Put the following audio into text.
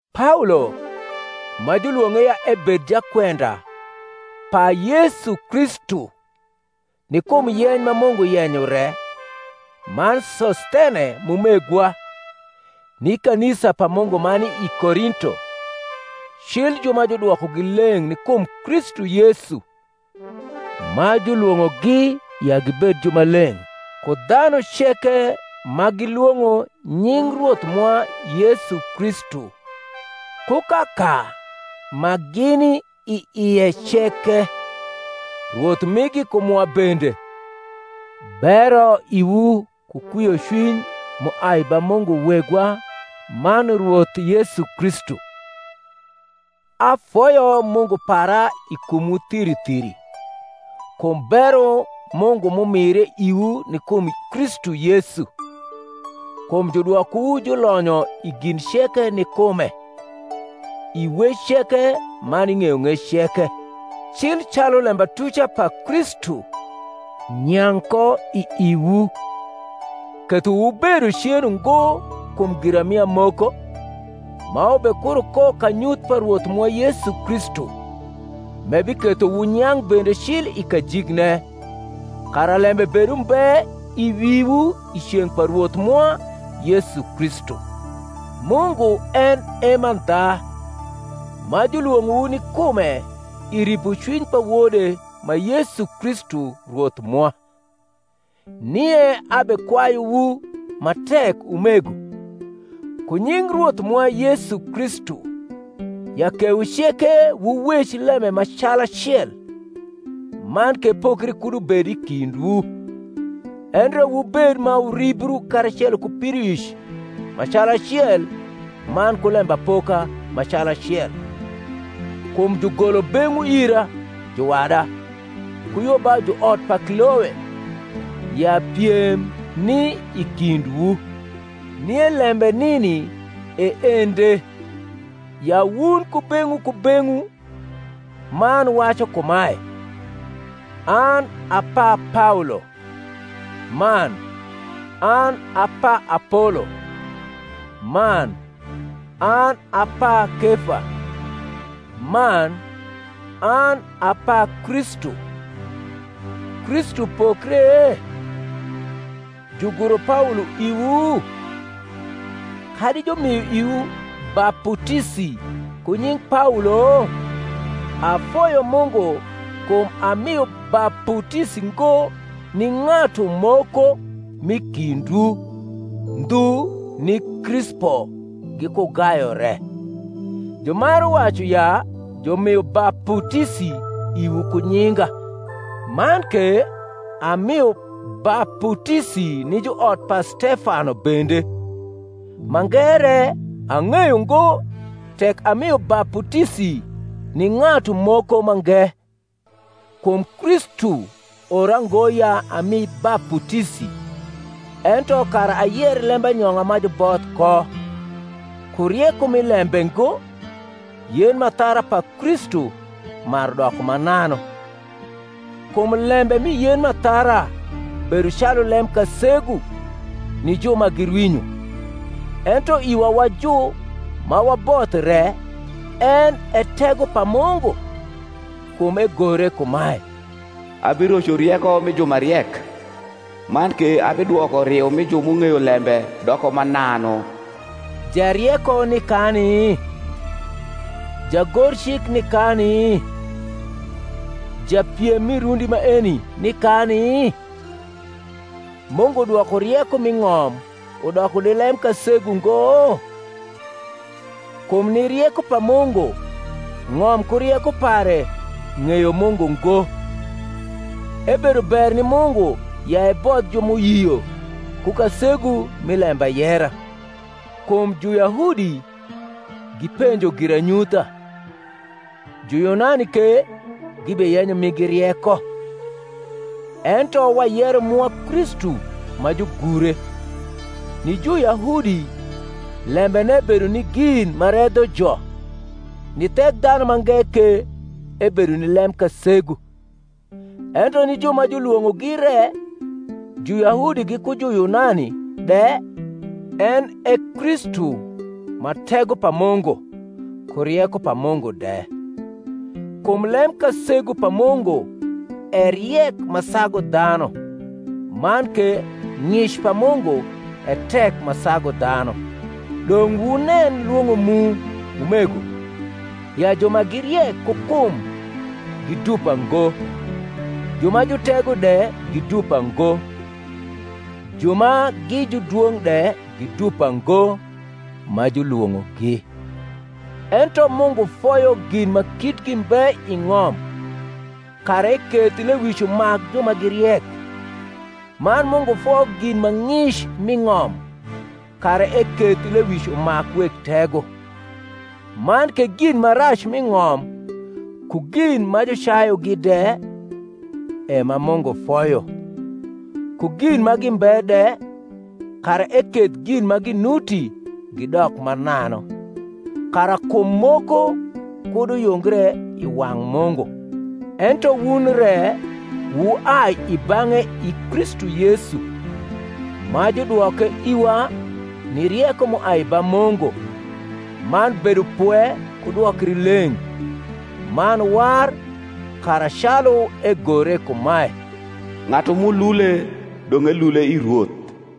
Paolo, ma julwong’e ya ebed jakwenda pa Yesu Kristu ni kum yeny ma Mungu yenyo re, man Sosthene m’umegwa, ni kanisa pa Mungu ma ni i Korinto, cil ju ma judwokogi leng’ ni kum Kristu Yesu, ma julwong’ogi ya gibed jumaleng’ ku dhanu ceke ma gilwong’o nying Rwoth mwa Yesu Kristu ku kaka ma gini i ie ceke, Rwoth migi ku mwa bende: Bero iwu ku kwiocwiny m’uai ba Mungu Wegwa man Rwoth Yesu Kristu. Afoyo Mungu para i kumwu thiri thiri, kum bero Mungu m’umire iwu ni kum Kristu Yesu; kum judwokowu julonyo i gin ceke ni kume, i wec ceke man i ng’eyong’ec ceke; cil calu lembatuca pa Kristu nyang’ ko i iwu: ketho wubedo cen ungo kum giramia moko; ma wubekuro ko kanyuth pa Rwoth mwa Yesu Kristu; m’ebiketho wunyang’ bende cil i kajikne, kara lembe bed umbe i wiwu i ceng’ pa Rwoth mwa Yesu Kristu. Mungu en e mandha, ma julwong’owu ni kume i ripocwiny pa Wode ma Yesu Kristu Rwoth mwa. Nie abekwayuwu ma tek, umego, ku nying Rwoth mwa Yesu Kristu, ya kewu ceke wuwec lembe ma calacel, man ke pokri kud ubed i kindwu; endre wubed ma wuribru karacelo ku pidoic ma calacel man ku lembapoka ma calacel. Kum jugolo beng’wu ira, juwada, ku yo ba juot pa Kloe, ya piem ni i kindwu. Nie lembe nini e ende, ya wun kubeng’wu kubeng’wu man wacu kumae, An a pa Paolo; man, An a pa Apolo; man, An a pa Kefa; man, An a pa Kristu. Kristu pokre? juguro Paolo iwu? kadi jumio iwu baputisi ku nying Paolo? Afoyo Mungu kum amio baputisi ngo ni ng’atu moko m’i kindwu, ndhu ni Krispo giku Gayo re; jumaru wacu ya jumio baputisi iwu ku nyinga. Man ke amio baputisi ni juot pa Stefano bende: mange re, ang’eyo ngo tek amio baputisi ni ng’atu moko mange. Kum Kristu ora ngo ya ami baputisi, ento kara ayer lembanyong’a ma juboth ko: ku rieko mi lembe ngo, yen m’athara pa Kristu maru doko mananu. Kum lembe mi yen m’athara bedo calu lemkasegu ni ju ma girwinyo; ento iwa wa ju ma waboth re en e tego pa Mungu. Kum egore kumae, Abiroco rieko mi ju ma riek, Man ke abidwoko riu mi ju m’ung’eyo lembe doko mananu. Jarieko ni kani? jagorcik ni kani? japiem mi rundi maeni ni kani? Mungu dwoko rieko m’i ng’om udoko ni lemkasegu ngo? Kum ni rieko pa Mungu ng’om ku rieko pare ng’eyo Mungu ngo, ebedo ber ni Mungu ya ebodh ju m’uyio ku kasegu mi lembayera. Kum Juyahudi gipenjo giranyutha, Juyunani ke gibeyenyo migi rieko: ento wayero mwa Kristu ma jugure, ni Juyahudi lembene bedo ni gin ma redho jo, ni Thekdhanumange ke ebedo ni lemkasegu; ento ni ju ma julwong’ogi re, Juyahudi giku Juyunani de, en e Kristu ma ego pa Mungu, ku rieko pa Mungu de. Kum lemkasegu pa Mungu e riek ma sagu dhanu; man ke ng’ic pa Mungu e tek ma sagu dhanu. Dong’ wunen lwong’o mu, umego, ya ju ma gi riek ku kum gi dupa ngo, ju ma jutego de gi dupa ngo, ju ma gi judwong’ de gi dupa ngo, ma julwong’ogi: ento Mungu foyo gin ma kitgi mbe i ng’om, kara eketh lewic umak ju ma gi riek; man Mungu foyo gin ma ng’ic m’i ng’om, kara eketh lewic umak weg tego; man ke gin ma rac m’i ng’om, ku gin ma jucayugi de, e ma Mungu foyo, ku gin ma gimbe de, kara eketh gin ma ginuti gidok mananu: kara kum moko kud uyungre i wang’ Mungu. Ento wun re wuai i bang’e i Kristu Yesu, ma judwoke iwa ni rieko m’uai ba Mungu, man bedopwe ku dwokrileng’, man war: kara, calu egore kumae, Ng’atu m’ulule, dong’ elule i Rwoth.